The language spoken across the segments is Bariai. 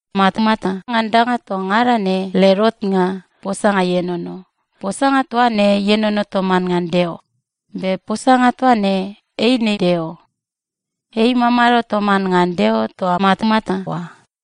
Matamata ngan danga toa ngada ne led otnga, Posanga ienono. Posanga toa ne ienono toman ngan Deo, be Posanga toa ne eine Deo. Ei imamado toman ngan Deo toa matamata oa.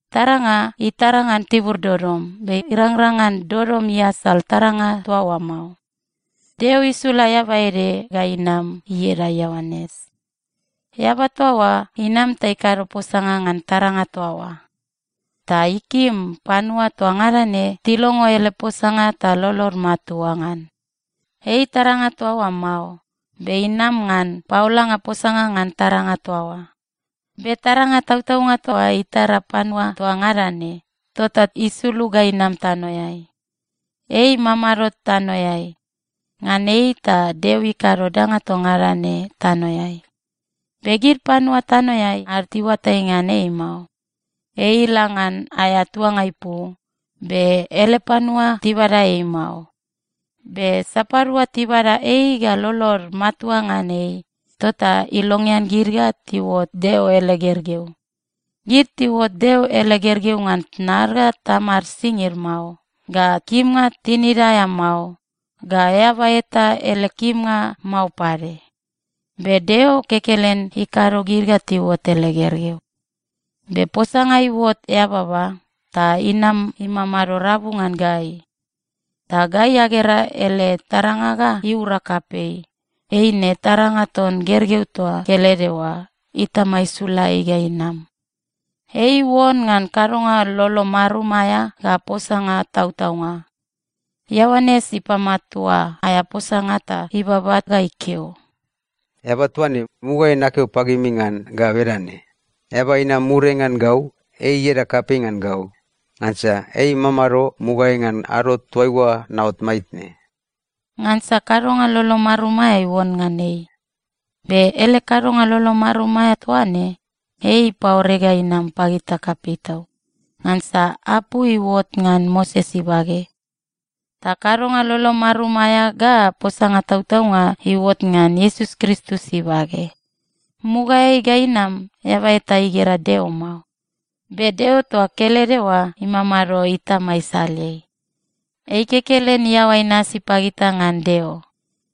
Taranga itara ngan tibur dodom, be irangrang ngan dodom iasal taranga toa oa mao. Deo isula eaba ede ga inam ieda Ioanes. Eaba toa oa inam ta ikado posanga ngan taranga toa oa. Ta ikim panua toa ngada ne tilongo ele posanga ta lolod matua ngan. Ei taranga toa oa mao, be inam ngan paolanga posanga ngan taranga toa oa. Be taranga tautaunga toa itara panua toa ngada ne, tota isulug ga inam tanoeai. Ei imamado tanoeai. Ngan ei, ta Deo ikado danga toa ngada ne tanoeai. Be gid panua tanoeai ad tiuatai ngan ei mao. Ei ila ngan aea tuanga ipu, be ele panua tibada ei mao. Be sapadua tibada ei ga lolod matua ngan ei, tota ilongean gid ga tiuot Deo ele gergeu. Gid tiuot Deo ele gergeu ngan tnad ga tamad singid mao, ga kimnga tinida aea mao, ga eaba eta ele kimnga mao pade. Be Deo kekelen ikado gid ga tiuot ele gergeu. Be Posanga iuot eababa, ta inam imamado rabu ngan gai. Ta gai agera ele taranga ga iura kapei, eine taranga ton gergeu toa kelede oa Itama isula ei ga inam. Ei iuon ngan kadonga lolo marum aea ga posanga tautaunga. Ioanes ipamatua aea posanga ta ibaba ga ikeo, “Eaba toa ne, mugaeai nakeo pagimi ngan ga bedane, ‘Eaba inam muriai ngan gau, ei ieda kapei ngan gau. Ngansa ei imamado mugaeai ngan ado toaiua naot maitne.’” Ngansa kadonga lolo marum aea iuon ngan ei. Be ele kadonga lolo marum aea toa ne, ei ipaore ga inam pagita kapei tau. Ngansa apu iuot ngan Moses ibage, ta kadonga lolo marum aea ga posanga tautaunga iuot ngan Iesus Kristus ibage. Mugaeai ga inam, eaba eta igera Deo mao, be Deo toa kelede oa, imamado Itama isaleai, ei kekelen iaoa inasi pagita ngan Deo.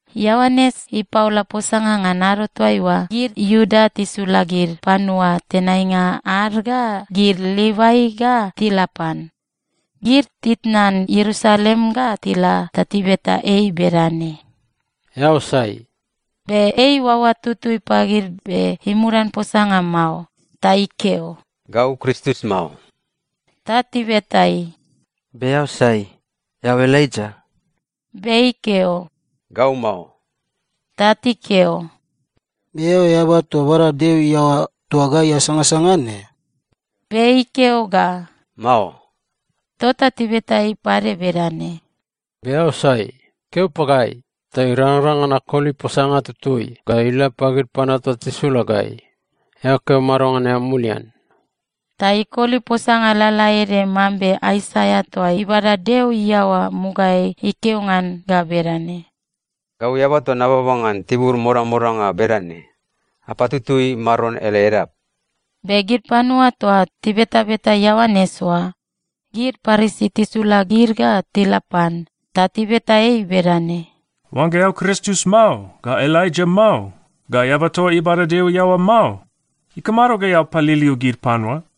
Ioanes ipaola posanga ngan ado toaiua gid Iuda tisula gid panua tenainga ad ga gid Livai ga tila pan. Gid titnan Ierusalem ga tila ta tibeta ei bedane, “Eao sai?” Be ei iuaoa tutui pagid be imudan posanga mao, ta ikeo, “Gau Kristus mao.” Ta tibeta ei, “Be eao sai? Eao Elaija?” Be ikeo, “Gau mao.” Ta tikeo, “Be eao eaba toa bada Deo iaoa toa gai asangasanga ne?” Be ikeo ga, “Mao.” Tota tibeta ei pade bedane, “Be eao sai? Keo pagai ta irangrang ngan akoli posanga tutui ga ila pagid panua toa tisula gai. Eao keo mado ngan eao mulian?” Ta ikoli posanga lalaede mambe Aisaia toa ibada Deo iaoa mugaeai ikeo ngan ga bedane, “Gau eaba toa nababa ngan tibur modamodanga bedane, ‘Apatutui Maron ele edap.’” Be gid panua toa tibetabeta Ioanes oa, gid Parisi tisula gid ga tila pan. Ta tibeta ei bedane, “Oangga eao Kristus mao, ga Elaija mao, ga eaba toa ibada Deo iaoa mao, ikamado ga eao paliliu gid panua?”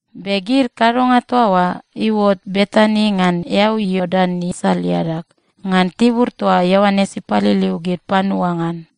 Be gid kadonga toa oa iuot Betani ngan eau Iordan isal iadag, ngan tibur toa Ioanes ipaliliu gid panua ngan.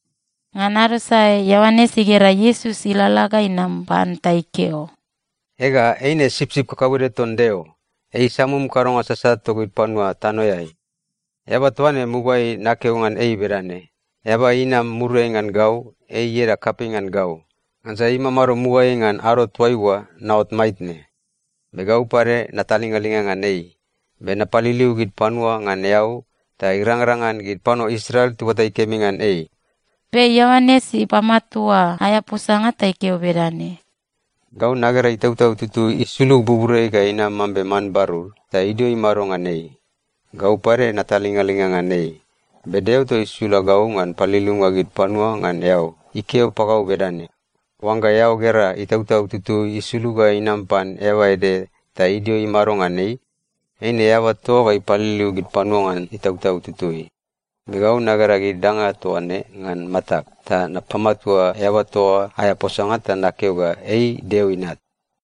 Ngan ado sae, Ioanes igera Iesus ilalala ga inam pan ta ikeo, “Ega, eine Sipsip kakauede ton Deo. Ei isamum kadonga sasat togid panua tanoeai. Eaba toa ne, mugaeai nakeo ngan ei bedane, ‘Eaba inam muriai ngan gau, ei ieda kapei ngan gau. Ngansa ei imamado mugaeai ngan ado toaiua naot maitne.’ Be gau pade natalingalinga ngan ei. Be napaliliu gid panua ngan eau ta irangrang ngan gid panua Israel tiuatai kemi ngan ei.” Be Ioanes ipamatua aea posanga ta ikeo bedane, “Gau nagera Itautau Tutui isulug buburiai ga inam mambe man barur, ta idio imado ngan ei. Gau pade natalingalinga ngan ei. Be Deo toa isula gau ngan paliliunga gid panua ngan eau, ikeo pagau bedane, ‘Oangga eao gera Itautau Tutui isulug ga inam pan eaba ede ta idio imado ngan ei, eine eaba toa oa ga ipaliliu gid panua ngan Itautau Tutui.’ Be gau nagera gid danga toa ne ngan matag, ta napamatua eaba toa oa aea posanga ta nakeo ga ei Deo Inat.”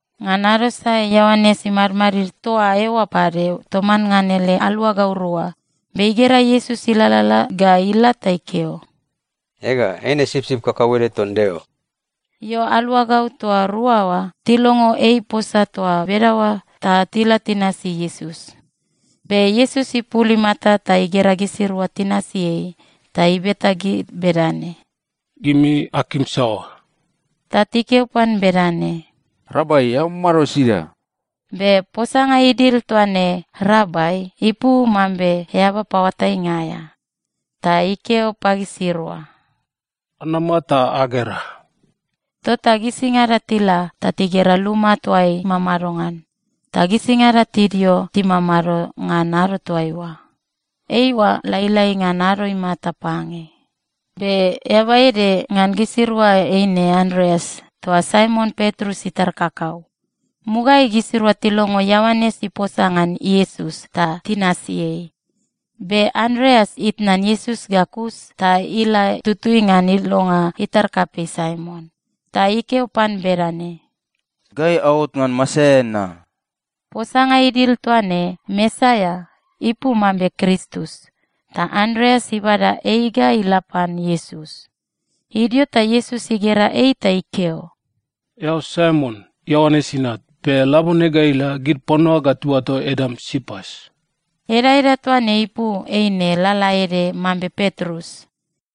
Ngan ado sae Ioanes imadmadid toa eoa pade toman ngan ele aluagau rua. Be igera Iesus ilalala ga ila ta ikeo, “Ega, eine Sipsip kakauede ton Deo.” Io, aluagau toa rua oa tilongo ei iposa toa bedaoa ta tila tinasi Iesus. Be Iesus ipul imata ta igera gisirua tinasi ei, ta ibeta gid bedane, “Gimi akim saoa?” Ta tikeo pan bedane, “Rabai, eao mamado sida?” Be posanga idil toa ne “Rabai” ipu mambe Eaba Paoatainga aea. Ta ikeo pagisirua, “Anama ta agera.” Tota gisingada tila ta tigera luma toa ei imamado ngan, ta gisingada tidio timamado ngan ado toaiua. Eiua lailai ngan ado imata pange. Be eaba ede ngan gisirua eine Andreas toa Saimon Petrus itar kakau. Mugaeai gisirua tilongo Ioanes iposa ngan Iesus, ta tinasi ei. Be Andreas itnan Iesus ga kus ta ila tutui ngan ilonga itar kapei Saimon, ta ikeo pan bedane, “Gai aot ngan Mesaia na.” Posanga idil toa ne “Mesaia” ipu mambe Kristus. Ta Andreas ibada ei ga ila pan Iesus. Idio ta Iesus igera ei ta ikeo, “Eao Saimon, Ioanes inat. Be labone ga ila, gid panua ga tiuato edam Sipas.” Edaeda toa ne ipu eine lalaede mambe Petrus.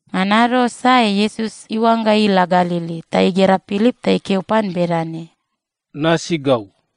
Ngan ado sae Iesus iuangga ila Galili, ta igera Pilip ta ikeo pan bedane, “Nasi gau.”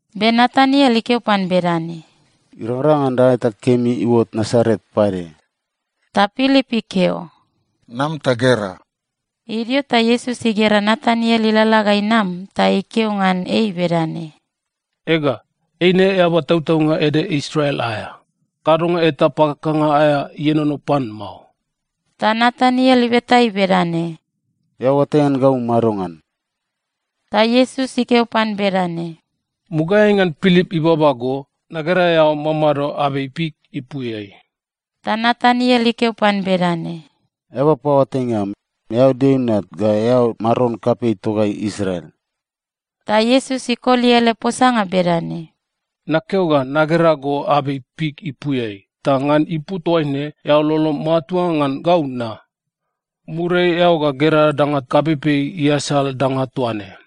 Be Nataniel ikeo pan bedane, “Irangrang ngan danga eta kemi iuot Nasaret pade?” Ta Pilip ikeo, “Nam ta gera.” Idio ta Iesus igera Nataniel ilalala ga inam ta ikeo ngan ei bedane, “Ega, eine eaba tautaunga ede Israel aea. Kadonga eta pakakanga aea ienono pan mao.” Ta Nataniel ibeta ei bedane, “Eao oatai ngan gau madongan?” Ta Iesus ikeo pan bedane, “Mugaeai ngan Pilip ibaba go, nagera eao mamado abei fik ipuiai.” Ta Nataniel ikeo pan bedane, “Eaba paoatainga am, eao Deo Inat, ga eao Maron kapei togai Israel.” Ta Iesus ikoli ele posanga bedane, “Nakeo ga nagera go abei fik ipuiai, ta ngan ipu toaine eao lolom matua ngan gau na? Muriai eao ga gera danga kapeipei iasal danga toa ne.”